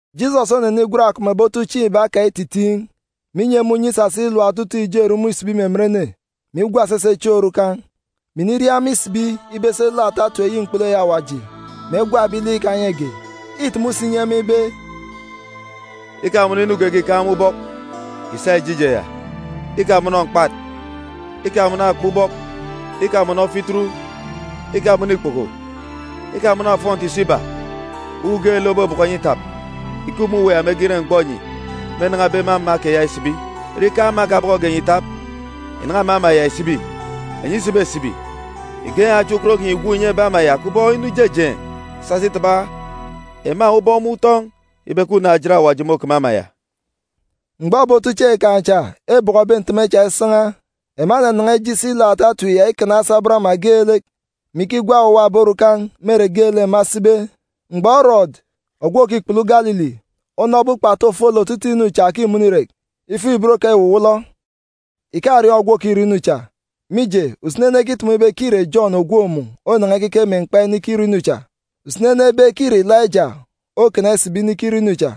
Jisọs onenigwen akọp mè ebi otuchieen̄ iba kan̄ ititiin̄, mè inyi ema unye isasa ilap otutuuk ijo erumun̄ isibi me emen ene, mè igwa esese chieen̄ orukan̄, mè iniria ema isibi ibe esi elook ata etip eyi mkpulu eyi Awaji, mè egwa ebi lek ikanyege. Îtumu si inyi ema ibe, “Ikamọnọ inu geege ìkaan̄ me ubọk ìsa ìje ije ya. Ikamọnọ mkpat, ikamọnọ akpa ubọk, ikamọnọ fituru, ikamọnọ ikpoko, ikamọnọ ofọnti ìso iba. Uwu geelek òbọbọkọ enyi itap, ìkup me uwu ya mege ire mgbọ enyi mênan̄abe me ama keya isibi. Ire ikaan̄ ama ekabọkọge enyi ìtap, ìnan̄a me ama ya ìsibi. Enyi isibesibi, ìgen̄ achiaan̄ ukot kinyi ìgwook ìnyi ebi ama ya kubọk inu ijejeen̄ isasa itaba ema ubọk me utọn̄ ibe ke unaan̄-ejit Awaji môkeme ama ya.” Mgbọ ebi otuchieen̄ kan̄ cha ebọkọbe nteme cha isan̄a, ema enanan̄a ije isi ilook ata etip ya ikana asabọn ama geelek, mè ikigwa owuwa ebi orukan̄ me ere geelek ema esibe. Mgbọ Erọdu ogwu òkikpulu Galili, onọbe ukpatu ofolek otutuuk inu cha òkimọnọ irek, ifuk-ibot kan̄ îwuwọlọ. Ìkariọọn̄ ogwu òkirọ inu cha, mije, usini ene ekitumu ibe ke îre Jọn ògwook mun̄ onan̄a ikeke me mkpa inikirọ inu cha. Usini ene ebe ke îre Ilaija okana isibi inikirọ inu cha.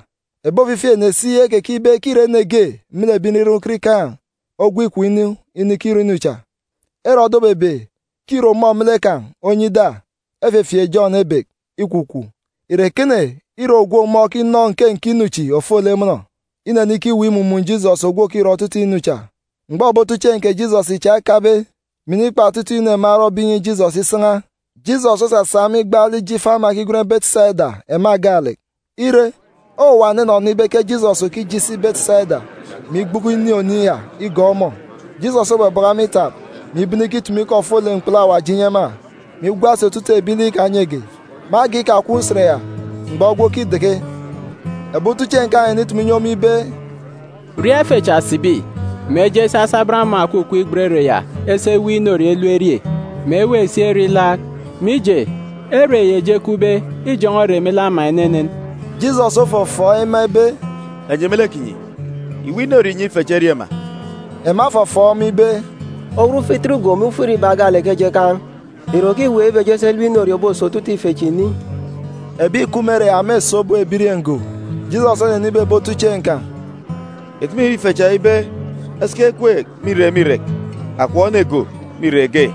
Ebi ofifi ene si ekekibe ke îre ene ge me lek ebi nriran ukot ikaan̄ ogwu ikom inu inikirọ inu cha. Erọdu obebe ke îre ọmọ me lek kan̄ onyi ida, efefieek Jọn ebek, ikwukwu. Ìre ekene ire ogwu, ọmọ okinọ nke nke inu chi ofolek mọnọ? Inenikiweek imumun̄ Jisọs ogwu òkirọ otutuuk inu cha. Mgbọ ebi otuchieen̄ kè Jisọs cha ekabe, mè inikpa otutuuk inu ema erọbe inyi Jisọs isan̄a, Jisọs osasa ema igbaalek ije ifo ama Betisaida ema gaalek. Ire, owuwa ene enọnọ ibe ke Jisọs òkije isi Betisaida, mè igbuku inin̄ oniin̄ ya igọọk ọmọ. Jisọs obọbọkọ ema itap, mè ibene ikitumu ikọ ofolek mkpulu Awaji inyi ema, mè igwa si otutuuk ebi lek ikanyege. Me agan̄ ikakwun̄ usen ya, mgbọ egwe okideke, ebi otuchieen̄ kan̄ enenitumu inyi ọmọ ibe, “Ria ife chi sibi, mè eje esi asabọn ama òkukup igbet ere yi esi eweek inorie elep erie, mè eweek si ere ilaak, mije, ere yi eji ekupbe îjọn̄ọ ere me lek ama enenen.” Jisọs ofọfọọk ema ibe, “Enyi me lek kinyi, ìweek inorie ìnyi ife chi erie ma.” Ema efọfọọk ọmọ ibe, “Owut fituru go mè ufuk irin̄ iba gaalek ke eji ekaan̄. Ìre òkiweek ibe eji esi elep inorie òboso otutuuk ife chi ni?” (Ebi ìkup me ere ya mêso obop ebirieen̄ go.) Jisọs onenibe ebi otuchieen̄ kan̄, “Ìtumu ìnyi ife cha ibe esiki ekweek me irek me irek, akọp ene go go me irek ge.”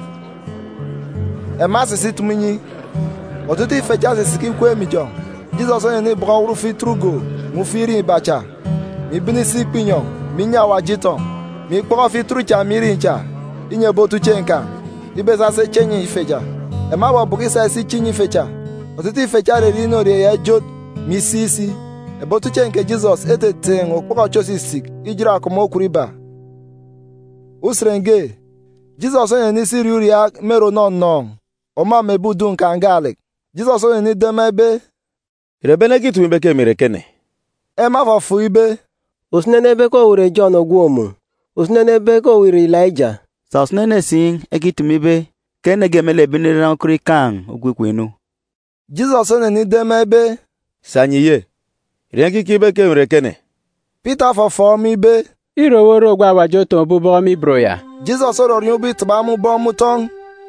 Ema esisi itumu inyi. Otutuuk ife cha esisiki ikweek me ijọn̄. Jisọs onenibọkọ owut fituru go mè ufuk irin̄ iba cha, mè ibene isi ikpọ inyọn̄, mè inyi Awaji itọn̄, mè ikpọkọ fituru cha mè irin̄ cha inyi ebi otuchieen̄ kan̄ ibe esa esi eche enyi ife cha. Ema ebọbọkọ isa isi iche inyi ife cha. Otutuuk ife cha ererie inorie ya ijot, mè isik si. Ebi otuchieen̄ kè Jisọs eteteen̄ okpọkọ echi òsisik ijot akọp mè okwun iba. Usen ge, Jisọs onenisi iriaak uriaak me ere ònọnọọn̄, ọmọ mè ebi udun̄ kan̄ gaalek. Jisọs onenido ema ibe, “Ìre ebi ene ekitumu ibe ke emi ìre ekene?” Ema efọfọọk ibe, “Usini ene ebe ke owu ìre Jọn ògwook mun̄, usini ene ebe owu ìre Ilaija. Sà usini ene si ekitumu ibe ke ene ge me lek ebi nriran ukot ikaan̄ ogwu ikom inu.” Jisọs onenido ema ibe, “Sà enyi ye? Ìre enyi ekikeek ibe ke emi ìre ekene?” Pita ofọfọọk ọmọ ibe, “Îre owu ore ogwu Awaji otọkọbe aran̄ me ibot ya!” Jisọs orọriọọn̄ ubọk itaba ema ubọk me utọn̄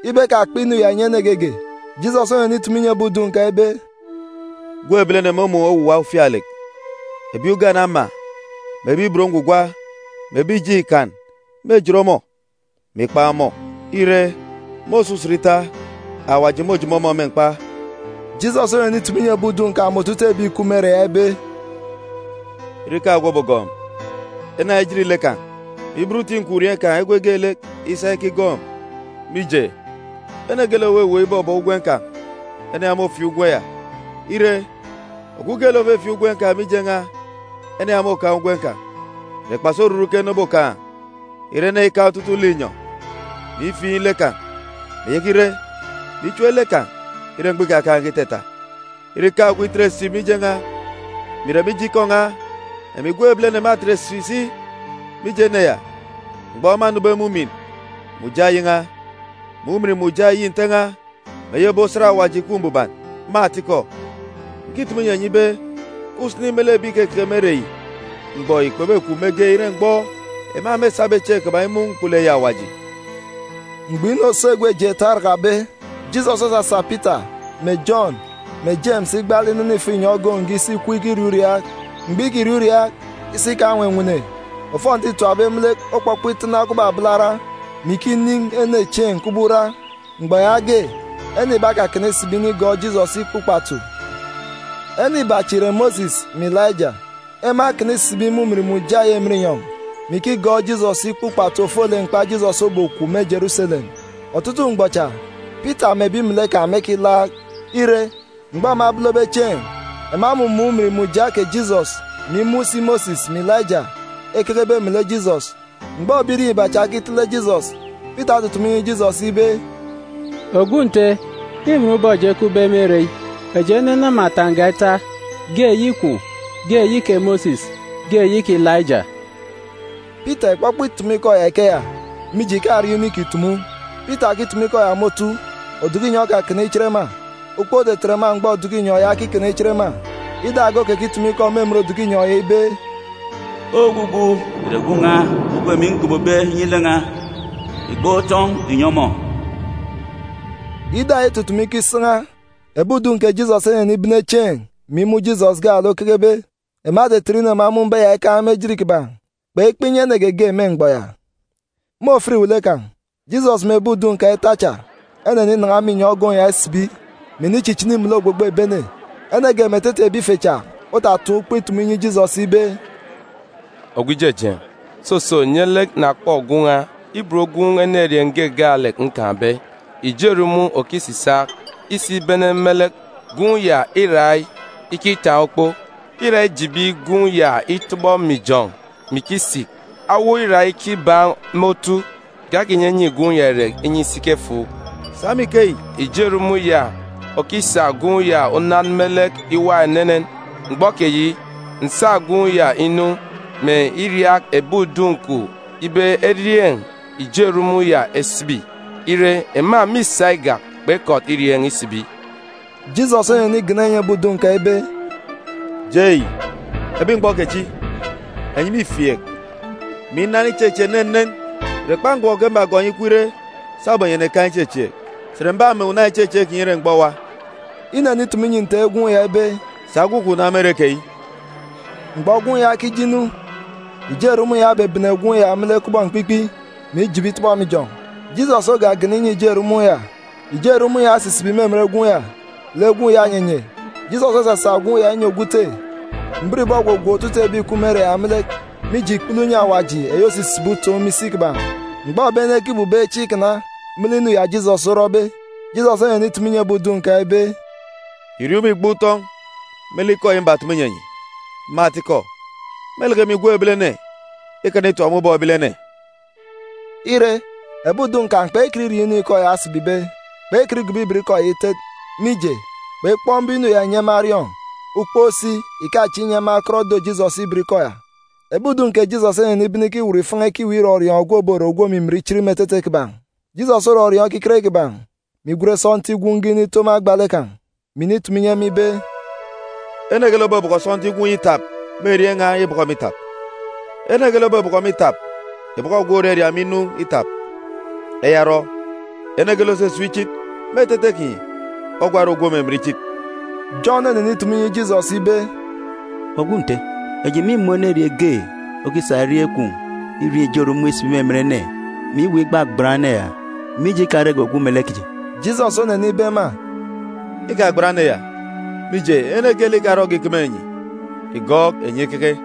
ibe ekakpa inu ya ìnyi ene geege. Jisọs onenitumu inyi ebi udun̄ kan̄ ibe, “Gwun̄ Ebilene mômun̄ owuwa ufialek. Ebi ugane ama, mè ebi ibot ngwugwa, mè ebi ìjeen̄ Ikan mêjit ọmọ, mè ikpan̄ ọmọ. Ire, me òso egwe ita, Awaji môjomo ọmọ me mkpa.” Jisọs onenitumu inyi ebi udun̄ kan̄ mè otutuuk ebi ìkup me ere ya ibe, “Ire ikaan̄ ogwu òbogọọk emi, ene ya ijit lek kan̄, mè iben uti nkwurieen̄ kan̄ egwe geelek isa ikigọọk emi. Mije, ene geelek òweweek ibọbọọk ugwem kan̄, ene ya môfiin̄ ugwem ya. Ire, ogwu geelek òfifiin̄ ugwem kan̄ mije n̄a, ene ya môkaan̄ ugwem kan̄. Ìre kpasi oruru ke ene obokaan̄, ire ene ikaan̄ otutuuk linyọn̄, mè ifiin̄ lek kan̄, mè ìyaka ire, mè ichep lek kan̄ ire mgbọ ikakaan̄ge itata? Ire ikaan̄ ogwu itet esip mije n̄a, mè ìre mije ikọ n̄a, emi Gwun̄ Ebilene mâtet esip si mije ene ya mgbọ mânube me ujamgbugbo eyi n̄a, mè ujamgbugbo eyi Nte n̄a, mè eyi ebi osat Awaji ìkup mbuban. Me atikọ, ǹkitumu inyi enyi ibe ke usini me lek ebi ìkekeke me ere yi mgbọ yi kpebekwu mege ire mgbọ ema mêsabe chieen̄ kiban̄ imun̄ mkpulu eyi Awaji.” Mgbọ inu òso egwe jeeta orakabe, Jisọs osasa Pita, mè Jọn, mè Jemis igbaalek inene ifo inyọn̄ ogoon̄ ge isi ikup ikiriaak uriaak. Mgbọ îkiriaak uriaak, isi kan̄ onwenwene, ofọnti îtapbe me lek okpọkpọ itana kubọk abalara, mè ikinin̄ ene chieen̄ kubọk ura. Mgbọ yaage, ene iba ekakana isibi inikigọọk Jisọs ikpa ukpatu. Ene iba cha ìre Mosis mè Ilaija. Ema ekana isibi me ujamgbugbo eyi emen inyọn̄, mè ikigọọk Jisọs ikpa ukpatu ofolek mkpa Jisọs obokwu me Jeruselem. Otutuuk mgbọ cha, Pita mè ebi melek kan̄ mêkilaak. Ire, mgbọ ema ebolobe chieen̄, ema emumun̄ ujamgbugbo kè Jisọs, mè imun̄ si Mosis mè Ilaija ekekebe melek Jisọs. Mgbọ ebirieen̄ iba cha ekitele Jisọs, Pita otutumu inyi Jisọs ibe, “Ogwu Nte, înwọn ubọk eji ekupbe me ere yi. Eji enenama uwu ọfọ ita, ge eyi kwun̄, ge eyi kè Mosis, ge eyi kè Ilaija.” (Pita ìkpọkpọ itumu ikọ ya ikeya, mije, ìkariọọn̄ inu ìkitumu.) Pita òkitumu ikọ ya me otu, oduku inyọn̄ okakana ichit ema. Ukpook otetet ema mgbọ oduku inyọn̄ ya okikana ichit ema. Ida ge okekitumu ikọ me emen oduku inyọn̄ ya ibe, “Ogwugwu ìre Gwun̄ n̄a ogwu emi ngobobe inyi lek n̄a. Ìgban̄ utọn̄ ìnyi ọmọ!” Ida ya itutumu ikọ isan̄a, ebi udun̄ kè Jisọs enenibene chieen̄, mè imun̄ Jisọs gaalek okekebe. Ema etetet inu ema emun̄be ya ikaan̄ me ejit kiban̄. Kpekpa inyi ene geege me mgbọ ya. Me ofit iwele kan̄, Jisọs mè ebi udun̄ kan̄ ita cha eneninan̄a me inyọn̄ ogoon̄ ya isibi, mè inichichini melek ogbogbo ebi ene. Ene ge me etete ebi ife cha otataan̄ ukpo itumu inyi Jisọs ibe, “Ogwu Ijejeen̄, soso, nye lek na kpọ gwun̄ n̄a, ibot gwun̄ enerieen̄ ge gaalek nkaan̄be. Ijo erumun̄ okisisaak. Isibene me lek, gwun̄ ya îra ikitaan̄ ukpo. Îra ijibi gwun̄ ya itọbọ me ijọn̄ mè ikisik, awo îra ikibaan̄ me otu. Ìkakinyinyi gwun̄ ya irek inyi isiki efuuk. Sa me ikeyi, ijo erumun̄ ya òkisak gwun̄ ya unan me lek iwa enenen. Mgbọ keyi, nsa gwun̄ ya inu, mè iriaak ebi udun̄ kwun̄ ibe erieen̄ ijo erumun̄ ya esibi. Ire, ema mîsa igak, kpekọt irieen̄ isibi.” Jisọs onenigana inyi ebi udun̄ kan̄ ibe, “Jei, ebi mgbọ kechi, enyi mîfieek, mè inan ichechieek enenen! Ìre kpa mgbọ ke mbagọọk enyi ikup ire sabum enyi ènekaan̄ ichechieek? Sà ìre m̀bame una ichechieek kinyi ire mgbọ owa?” Inenitumu inyi nte gwun̄ ya ibe, “Sa gwun̄ kwun̄ na me ere keyi.” Mgbọ gwun̄ ya okije inu, ijo erumun̄ ya obebene gwun̄ ya me lek kubọk mkpikpi, mè ijibi itọbọ me ijọn̄. Jisọs ogagana inyi ijo erumun̄ ya, ijo erumun̄ ya osisibi me emen gwun̄ ya, lek gwun̄ ya onyenye. Jisọs osasa gwun̄ ya inyi ogwu ute. Mbiribọ ogwogwook otutuuk ebi ìkup me ere ya me lek, mije ikpele unye Awaji eyi òsisibi utoon̄ me isi kiban̄. Mgbọ ebi ene ekibubeek chieen̄ ikana me lek inu ya Jisọs orọbe, Jisọs onenitumu inyi ebi udun̄ kan̄ ibe, “Ìriọọn̄ ubọk ìgban̄ utọn̄ me lek ikọ yi mbatumu inyi enyi. Me atikọ, mêleke emi, Gwun̄ Ebilene, ikana itap me ubọk ebilene.” Ire, ebi udun̄ kan̄ kpekọt iriọọn̄ inu ikọ ya osibibe. Kpekọt igobo ibot ikọ ya itet, mije, kpekpọk mbum inu ya inyi ema eriọọn̄. Ukpook si ìkachieek inyi ema ekọt edo Jisọs ibot ikọ ya. Ebi udun̄ kè Jisọs enenibene ikiwut ifan̄a ikiweek irọriọọn̄ ogwu òbore ogwu òmimin ichit me etete kiban̄. Jisọs orọriọọn̄ ekiket kiban̄, mè igwen sọntiik gwun̄ ge inito me agba lek kan̄, mè initumu inyi ema ibe, “Ene geelek òbọbọkọ sọntiik gwun̄ yi itap me erieen̄ n̄a ìbọkọ emi itap. Ene geelek òbọbọkọ emi itap ìbọkọ ogwu òraria emi inu itap. Eya orọ, ene geelek òsisip ichit me etete kinyi, ogwa ore ogwu òmimin ichit.” Jọn onenitumu inyi Jisọs ibe, “Ogwu Nte, eji mîmun̄ enerieen̄ ge okisa erieen̄ kwun̄ irieen̄ ijo erumun̄ isibi me emen ene, mè iweek igbagban ene ya, mije ikarege ogwu melek kiji.” Jisọs onenibe ema, “Ikagban ene ya, mije, ene geelek ikarọge ìkeme enyi, ìgọọk enyi ikeke.”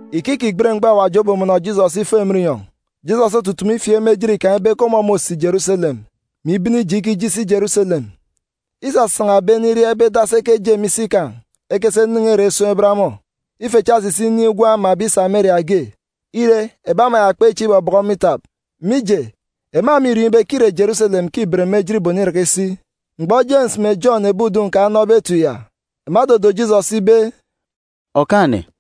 Ike îkigbet mgbọ Awaji obomọnọ Jisọs ifo emen inyọn̄, Jisọs otutumu ifieek me ejit kan̄ ibe ke ọmọ môsi Jeruselem, mè ibene ije ikije isi Jeruselem. Isasan̄a ebi ene iria ibe edasi ekeje me isi kan̄ ekesi enen̄e ere esun̄ eban ọmọ. Ife cha esisi inin̄ gwun̄ ama ebi Sameria ge. Ire, ebi ama ya kpechieek ibọbọkọ ọmọ itap, mije, ema mîriọọn̄ ibe ke îre Jeruselem ke îben me ejit iboniraka isi. Mgbọ Jemis mè Jọn ebi udun̄ kan̄ enọbe etip ya, ema edodo Jisọs ibe, “Okaan̄-ene,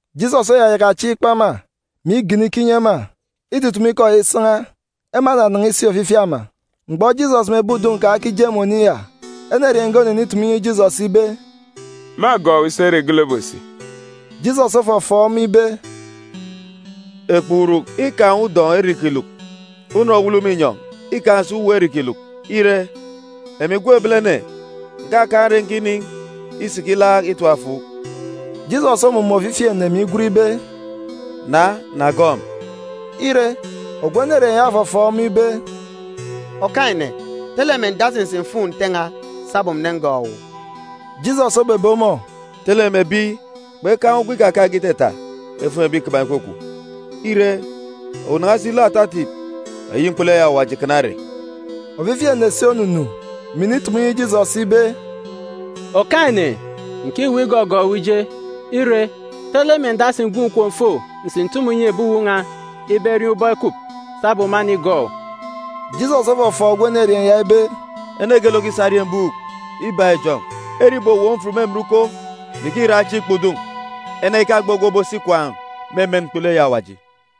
Jisọs oyayaka chieen̄ ikpọ ema, mè igana ikọ inyi ema. Itutumu ikọ ya isan̄a, ema enanan̄a isi ofifi ama. Mgbọ Jisọs mè ebi udun̄ kan̄ ekije me oniin̄ ya, enerieen̄ ge onenitumu inyi Jisọs ibe, “Mâgọọk owu isi ere geelek obosi.” Jisọs ofọfọọk ọmọ ibe, “Ekpuuruk îkaan̄ udọn̄ ere îkiluk, unọn òwulu me inyọn̄ îkaan̄ si uwu ere îkiluk. Ire, emi Gwun̄ Ebilene, ǹkakaan̄ ere nkinin̄ isiki ilaak itap efuuk.” Jisọs omumun̄ ofifi ene, mè igwen ibe, “Na, na gọọk emi.” Ire, ogwu enerieen̄ ya ofọfọọk ọmọ ibe, “Okaan̄-ene, tele mè ǹdasi ǹsi m̀fuun̄ nte n̄a sabum ǹnengọọk owu.” Jisọs obebe ọmọ, “Tele mè ebi kpekaan̄ ugwem ikakaan̄ge itata efuun̄ ebi kiban̄ ìkwukwu. Ire, owu nan̄a si look ata etip eyi mkpulu eyi Awaji kana ere.” Ofifi ene si onunu, mè initumu inyi Jisọs ibe, “Okaan̄-ene, ǹkiweek igọgọọk owu ije. Ire, tele mè ǹdasi ǹgwu ǹkom m̀fo ǹsi ǹtumu ǹnyi ebi uwu n̄a ibe eriọọn̄ ubọk ekup, sabum mânigọọk owu.” Jisọs ofọfọọk ogwu enerieen̄ ya ibe, “Ene geelek òkisa eriembuuk ibak ijọn̄ ere ìbowop mfut me emen uko, mè ikiraan̄ chieen̄ ikpọ udun̄, ene ya ìkagbe ogwu òbosi ikwaan̄ me emen mkpulu eyi Awaji.”